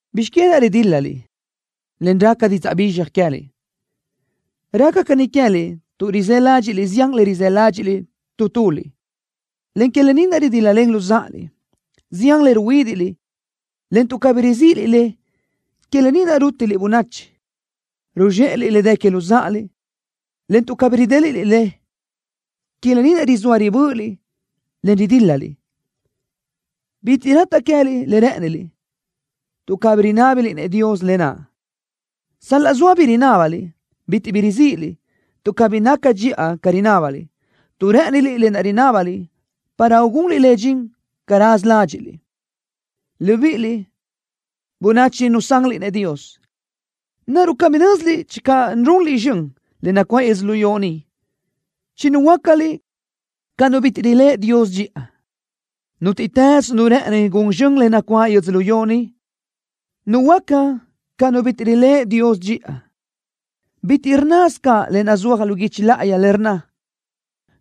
¿Bizx que naʼ ridíl-laliʼ, en raca didzaʼ bizxaj queë́liʼ? Raca caní queë́liʼ tuʼ rizë́ ládxiʼliʼ zián le rizë́ ládxiʼliʼ tu tuliʼ, en que lë ni naʼ ridíl-lalenliʼ luzáʼaliʼ. Zián le ruhuídiʼliʼ, en tuʼ cabí rizíʼiliʼ le, que lë ni naʼ rútiliʼ bönachi. Ruzxéʼeliʼ le dë que luzáʼaliʼ, en tuʼ cabí ridéliʼliʼ le, que lë ni naʼ rizóa ribö́ʼöliʼ, en ridíl-laliʼ. Bitiʼ rataʼ queë́liʼ le rë́ʼëniliʼ, tuʼ cabí rinábiliʼ-nëʼ Dios lë naʼ. Sal-laʼ zoa bi rinábaliʼ, bitiʼ bi rizíʼiliʼ, tuʼ cabí naca dxiʼa ca rinábaliʼ, tuʼ rë́ʼëniliʼ lë naʼ rinábaliʼ para ugunliʼ le dxin ca raza ládxiʼsiliʼ. Libíʼiliʼ, bönachi nusanliʼ-nëʼ Dios, ¿naruʼ cabí nö́ziliʼ channö runliʼ zxön le nacuáʼ yödzölió ni, chinuhuöácaliʼ ca nu bitiʼ riléʼe Dios dxiʼa? Nútiʼtës nu rë́ʼëni gun zxön le nacuáʼ yödzölió ni, nuhuöáca ca nu bitiʼ riléʼe Dios dxiʼa. Bitiʼ rnnasö caʼ le nazúaj lu guichi láʼayi le rnna: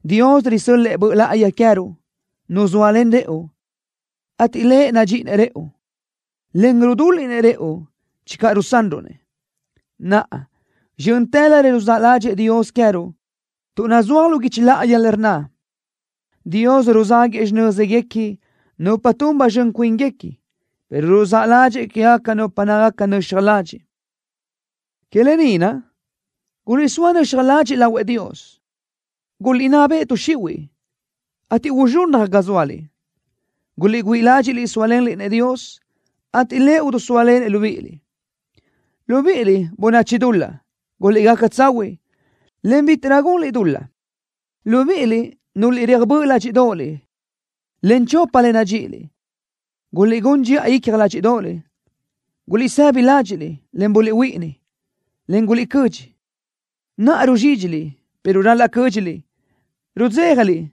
“Dios risö́l-lëʼë Dios Böʼ Láʼayi queë́ruʼ, Nu zóalen rëʼu, ateʼ Lëʼ nadxíʼinëʼ rëʼu, en rudúliʼnëʼ rëʼu channö rusanruʼ-nëʼ.” Naʼa, zxö́ntërö le ruzáʼ ládxëʼë Dios queë́ruʼ, tuʼ nazúaj lu guichi láʼayi le rnna: “Dios ruzáguëʼë xinö́zguequi nupa tun ba zxön cuínguequi, pero ruzáʼ ládxëʼë quégaca nupa nácagaca nöxaj ladxiʼ.” Que lë ni naʼ, guliʼsóa nöxaj ladxiʼ lahuëʼ Dios. Guliʼnná beʼe tuʼ xihuiʼ, ateʼ uzxunnaj ga zóaliʼ. Guliʼgüíʼ ládxiʼliʼ sóalenliʼ-nëʼ Dios, ateʼ Lëʼ idisóalenëʼ libíʼiliʼ. Libíʼiliʼ, bönachi dul-laʼ, guliʼgaca tsahuiʼ, en bítiʼrö gunliʼ dul-laʼ. Libíʼiliʼ, núlöliʼ reaj böʼ ládxiʼdoʼoliʼ, en chopa le nadxíʼiliʼ, guliʼgún dxiʼa icja ládxiʼdoʼoliʼ. Guliʼsëbi ládxiʼliʼ, en buliʼhuíʼini, en guliʼcödxi. Naʼa ruzxídxili, pero ral-laʼ cö́dxiliʼ. Rudzéjaliʼ,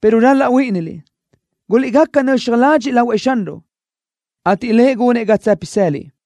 pero ral-laʼ huíʼiniliʼ. Guliʼgaca nöxaj ladxiʼ lahuëʼ Xanruʼ, ateʼ Lëʼ gunëʼ ga tsë́pisëliʼ.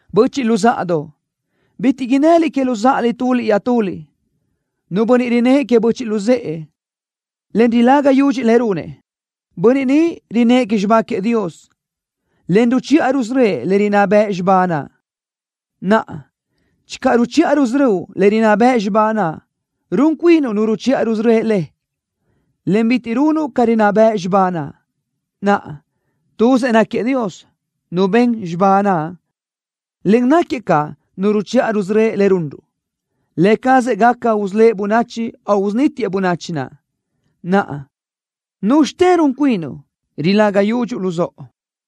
Böchiʼ luzáʼadoʼ, bitiʼ innëliʼ que luzáʼaliʼ tuliʼ iaʼtuliʼ. Nu bönniʼ rinnë́ʼ que böchiʼ luzë́ʼë, en rilaga yudxëʼ le runëʼ, bönniʼ ni rinnë́ʼ que xibá queëʼ Dios, en ruchiʼa rusörö́ëʼ le rinná bëʼ xibá naʼ. Naʼa, channö ruchiʼa rusörö́uʼ le rinná bëʼ xibá naʼ, run cuinuʼ nu ruchiʼa rusörö́ëʼ le, en bitiʼ runuʼ ca rinná bëʼ xibá naʼ. Naʼa, tuzëʼ náquiëʼ Dios, Nu ben xibá naʼ, en náquiëʼ caʼ Nu ruchiʼa rusörö́ëʼ le runruʼ. Lë cazëʼ gaca usölë́ʼ bönachi o usunítiëʼ bönachi naʼ. Naʼa, ¿núzxitë run cuinuʼ, rilaga yudxuʼ luzóʼo?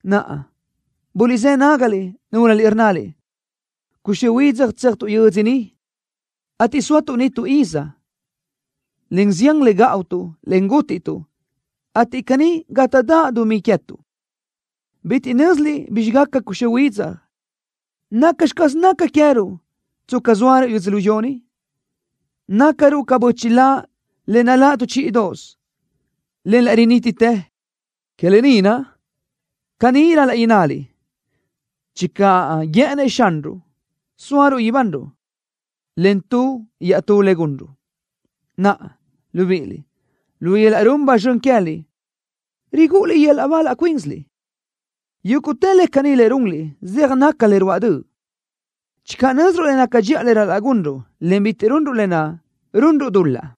Naʼa, buliʼzë́ nágaliʼ, núlöliʼ rnnaliʼ: “Cuxö́ huidzaj tséajtuʼ yödzö niʼ, ateʼ sóatuʼ niʼ tu iz, en zián le gáʼutuʼ, en útiʼtuʼ, ateʼ caní gátaʼdaʼ dumí queë́tuʼ.” Bitiʼ nö́ziliʼ bizxi gaca cuxö́ huidzaj. ¿Nacxi caz naca queë́ruʼ, tsca zóaruʼ yödzölió ni? Nácaruʼ ca bö́chila le naláʼ tu chíʼidoʼosö, en laʼ rinítitë. Que lë ni naʼ, caní ral-laʼ innaliʼ: “Channö guë́ʼënnëʼ Xanruʼ, sóaruʼ ibanruʼ, en tu iaʼtú le gunruʼ.” Naʼa, libíʼiliʼ, lu yöl-laʼ run ba zxön queë́liʼ rigúʼuliʼ yöl-laʼ ba laʼ cuínsiliʼ. Yúguʼtë le caní le runliʼ zeaj naca le ruáʼ döʼ. Channö nö́ziruʼ le naca dxiʼa le ral-laʼ gunruʼ, en bitiʼ gunruʼ lë naʼ, runruʼ dul-laʼ.